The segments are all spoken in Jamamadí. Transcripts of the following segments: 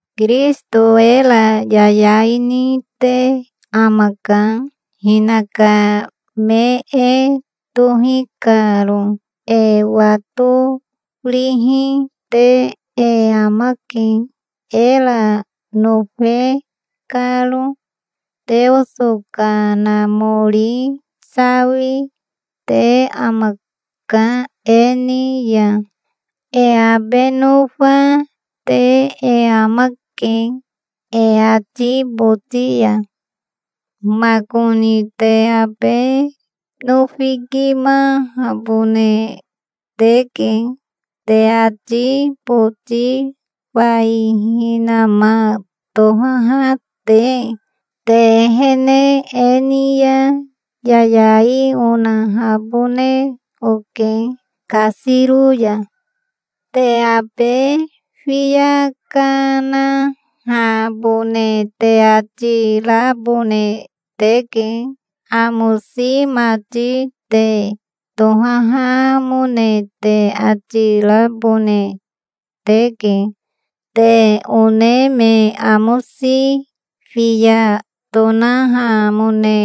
Kirisito era yayai nite amaka, hinaka me e tohi karo. E watorihi te e amake, era nofe karo. Teoso Kanamori sawi, te amaka e ni ya. E abe nofa, te e amake e ati boti ya. Makoni te abe nofikimahabone teke, te ati boti fai hinama tohaha te. Te ehene e ni ya yayai onahabone oke kasiro ya. Te abe fiya kanahabone te ati rabone teke. Amosi mati te tohahamone te ati rabone teke. Te one me amosi fiya tonahamone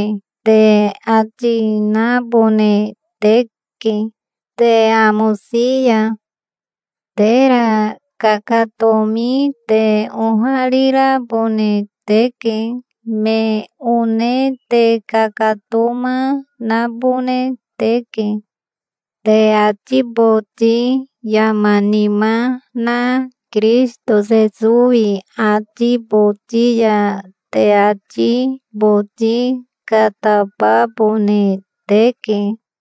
te ati nabone teke te amosi ya. Tera kakatomi te oharirabone teke. Me one te kakatoma nabone teke. Te ati boti yama nima na Kirisito Sesowi ati boti ya te ati boti katababone teke.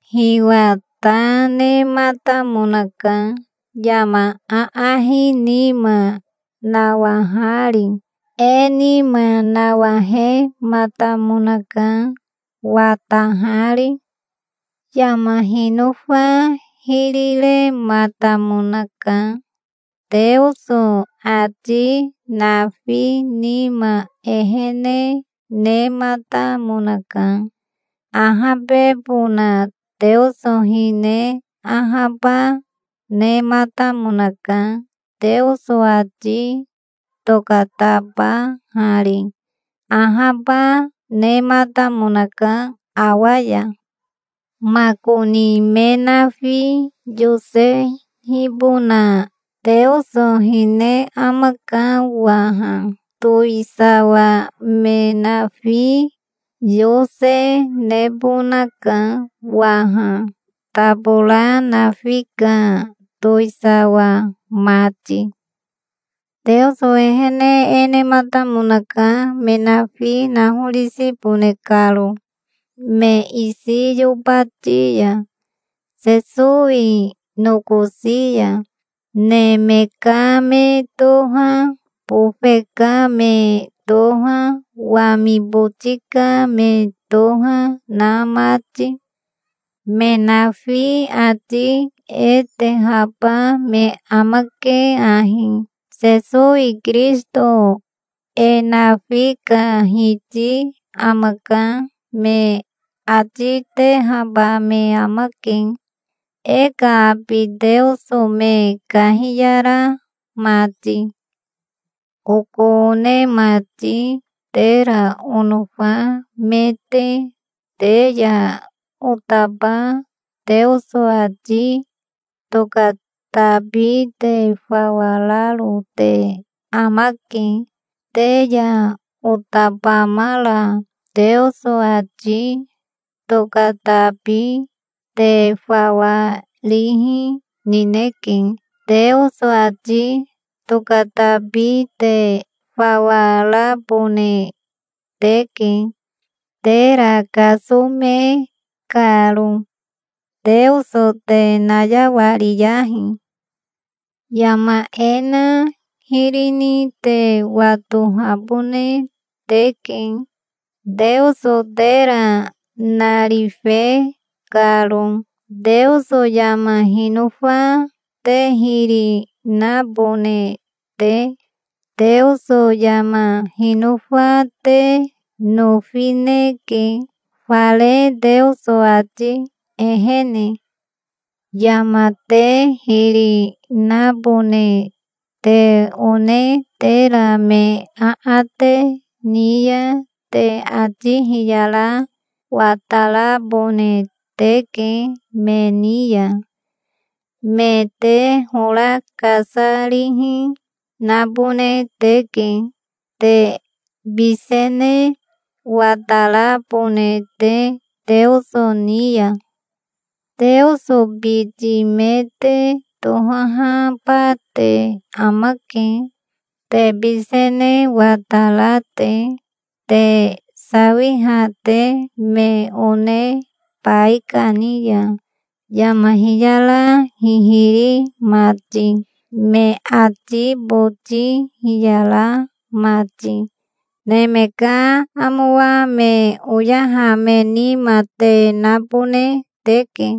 Hiwa ta nematamonaka, yama aahi nima nawahari. E nima nawahematamonaka, watahari. Yama hinofa hiri rematamonaka. Teoso ati nafi nima ehene nematamonaka. Ahabebona Teoso hine ahaba nematamonaka Teoso ati tokatabahari. Ahaba nematamonaka awa ya. Makoni me nafi yosehibona Teoso hine amaka waha. Towisawa me nafi yose nebonaka waha, tabora nafi ka towisawa mati. Teoso ehene e nematamonaka me nafi nahorisibone karo, me isi yobati ya, Sesowi nokosi ya, neme ka me toha, bofe ka me toha, wami boti ka me toha na mati. Me nafi ati e tehaba me amake ahi: "Sesowi Kirisito e nafi ka Hiti amaka", me ati tehaba me amake, e ka abi Teoso me kahiyara mati. Oko one mati, tera onofa me te, te ya otaba Teoso ati tokatabi te fawa raro te amake. Te ya otabamara Teoso ati tokatabi te fawa rihi nineke. Teoso ati tokatabi te fawa rabone teke, tera kasome karo. Teoso te nayawariyahi. Yama e na hiri ni te watohabone teke, Teoso tera narife karo, Teoso yama hinofa te hiri nabone te. Teoso yama hinofa te nofineke, fare Teoso ati ehene. Yama te hiri nabone te one tera me aate ni ya te ati hiyara watarabone teke me ni ya. Me te hora kasarihi nabone teke, te bisene watarabone te Teoso ni ya. Teoso biti me te tohahaba te amake, te bisene watara te, te sawiha te me one baikani ya, yama hiyara hihiri mati, me ati boti hiyara mati. Neme ka amowa me oyaha me nima te nabone teke.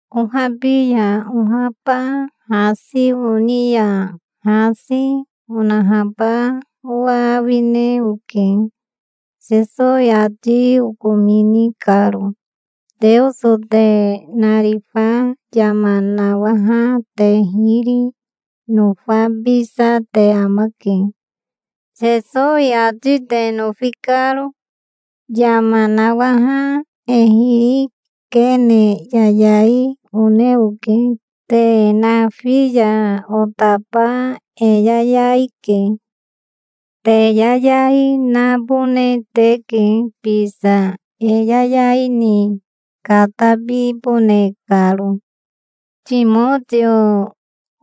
Ohabi ya ohaba hasi oni ya hasi, onahaba owa awine oke, Sesowi ati okomini karo. Teoso te narifa yama nawaha te hiri nofabisa te amake, Sesowi ati te nofi karo. Yama nawaha e hiri kene yayai one oke. Te nafi ya otaba e yayai ke. Te yayai nabone teke bisa, e yayai ni katabibone karo. Timotio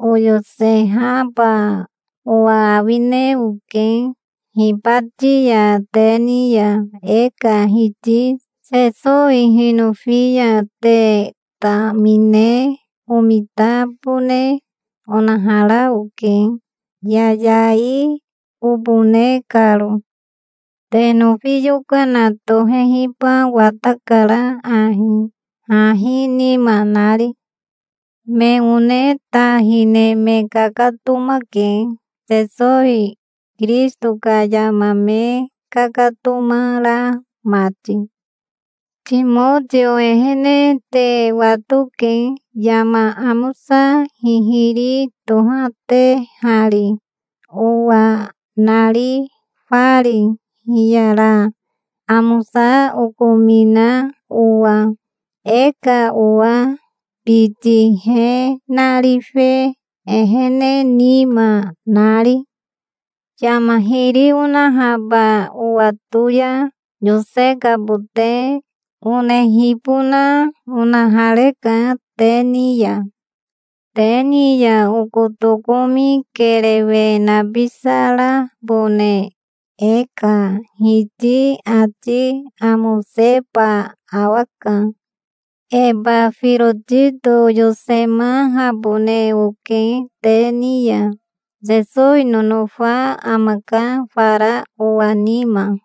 oyosehaba owa awine oke hibati ya te ni ya, e ka Hiti Sesowi hinofi ya. Te tamine omitabone onahara oke, yayai obone karo. Te nofi yokana tohehiba watakara ahi, hahi nima nari. Me one ta hine me kakatomake, Sesowi Kirisito ka yama me kakatoma ra mati. Timotio ehene te watoke, yama amosa hihiri tohatehari, owa narifari, hiyara amosa okomina owa, e ka owa biti he narife ehene nima nari. Yama hiri onahaba owato ya yosekabote onehibona onahareka te ni ya. Te ni ya oko tokomi kerewe nabisarabone e ka Hiti ati amoseba awaka. Ebafirotito oyosemahabone oke te ni ya. Sesowi nonofa amaka fara owa nima.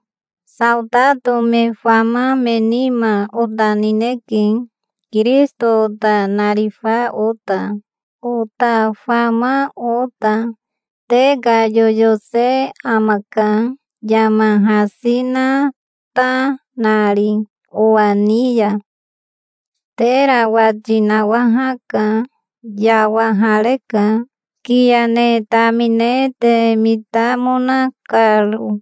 Saotato me fama me nima ota nineke, Kirisito ota narifa ota, ota fama ota. Te ka yoyose amaka, yama hasi na ta nari owa ni ya. Tera wati nawahaka. Yawahareka, kiya ne tamine te mitamona karo.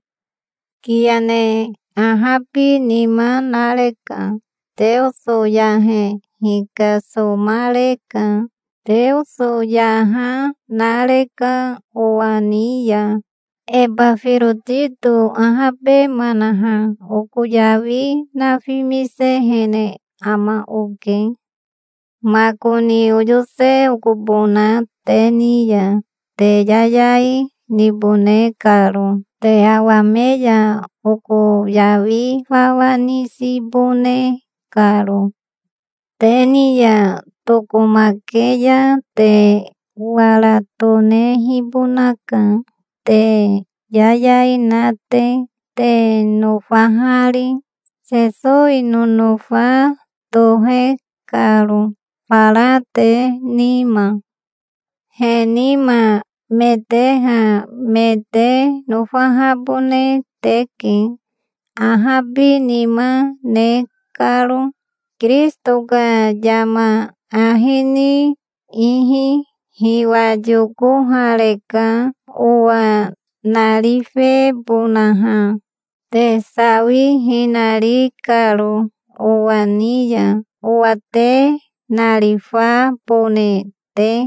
Kiya ne ahabinima nareka. Teoso yahe hikasomareka. Teoso yaha nareka owa ni ya. Ebafirotito ahabemanaha, oko yawi nafimisehene ama oke. Makoni oyose okobona te ni ya, te yayai nibone karo te awame ya, oko yawi fawa nisibone karo. Te ni ya tokomake ya te wara tonehibonaka, te yayai na te, te nofahari, Sesowi nonofa tohe karo fara te nima. He nima me teha me te nofahabone teke, ahabinima ne karo, Kirisito ka yama ahi ni ihi. Hiwa yokohareka owa narifebonaha, te sawihina ri karo owa ni ya, owa te narifabone te.